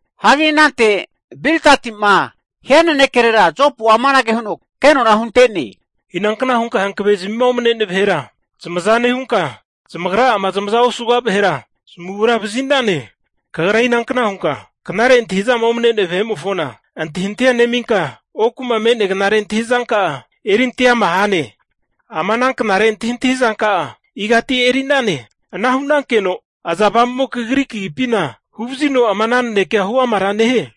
Hagi anante Bildati'ma hia nanekerera Jopu'a amanage huno kenona hunte'ne, Inankna hunka hankavezamima omne'nea vahera zamaza nehunka, zamagra'ama zamaza osuga vahera zamagura vazi'nane. Kagra inankna hunka knare antahi'zama omne'nea vahe'mofona antahintahia neminka, oku'ma me'nea knare antahi'zanka'a erinte ama hane? Ama ana knare antahintahi zanka'a igati eri'nane? Ana hu'nankeno iza avamu'mo kagri kagipina huvazino ama'na nanekea huamara nehie?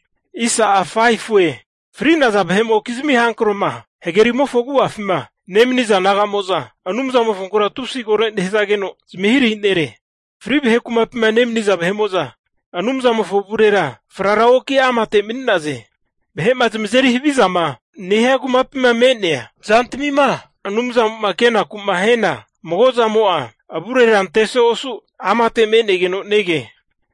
Fri'naza vahe'mokizmi hankro'ma hagerimofo agu'afima nemaniza naga'mo'za Anumzamofonkura tusi koro nehazageno zamahirahi nere. Fri vahe kumapima nemaniza vahe'mo'za Anumzamofo avurera frara oki amate mani'naze. Vahe'ma zamazeri havizama nehia kumapima me'nea zantamima Anumzamo'ma kenaku'ma hiana, mago zamo'a avurera anteso osu amate me'negeno nege.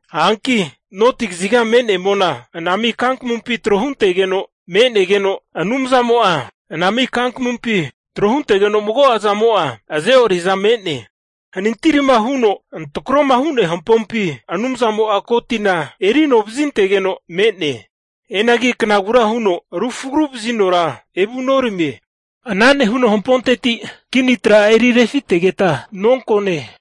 Hanki noti kaziga me'nea mona anami kankamumpi tro huntegeno me'negeno, Anumzamo'a anami kankamumpi tro huntegeno mago'zamo'a azeoriaza me'ne. Hanintirima huno antarakoma hu'nea hampompi Anumzamo'a ko tina eri ano vazintegeno me'ne. Hianagi knagura huno ana timo'a rufuragu vazinora evunoramie. Ana nehuno hamponteti kini tra'a erirefitegeta nonkone.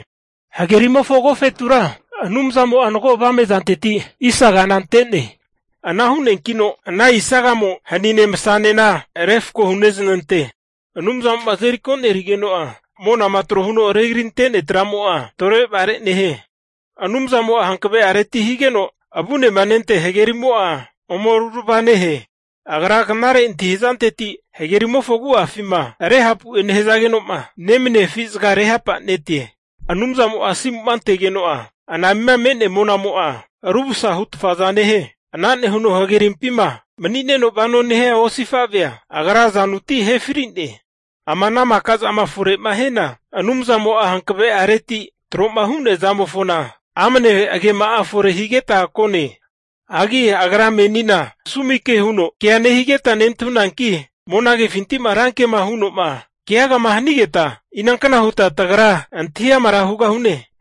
Hagerimofo agofetura Anumzamo'a mago avame'zanteti isagana ante'ne. Ana hu'neankino ana isagamo hanine masanena refko hunezanante. Anumzamo'ma monamofoma azeri konerigeno'a, monama tro huno regarinte'nea tra'mo'a torevare nehie. Anumzamo'a hankave'areti higeno avunemanentea hagerimo'a, ome rurava nehe. Agra knare antahi'zanteti, hagerimofo agu'afima Rehapu'e nehazageno'ma nemania afi'zaga rehapanetie. Anumzamo'ma asimu'ma antegeno'a, anamima me'nea monamo'a rumsa hutfaza nehie. Ana nehuno hagerimpima mani'neno vanoma nehia osifavea Agra azanuti ahe fri'ne. Ama ana maka zama fore'ma hiana, Anumzamo'a hankave'areti tro'ma hu'nea zamofona, amne agema'a fore higeta kone. Hagi Agra menina sumi ke huno kea nehigeta nentahunanki, monagefinti'ma rankema huno'ma keagama hanigeta, inankna huta tagra antahi amara hugahune?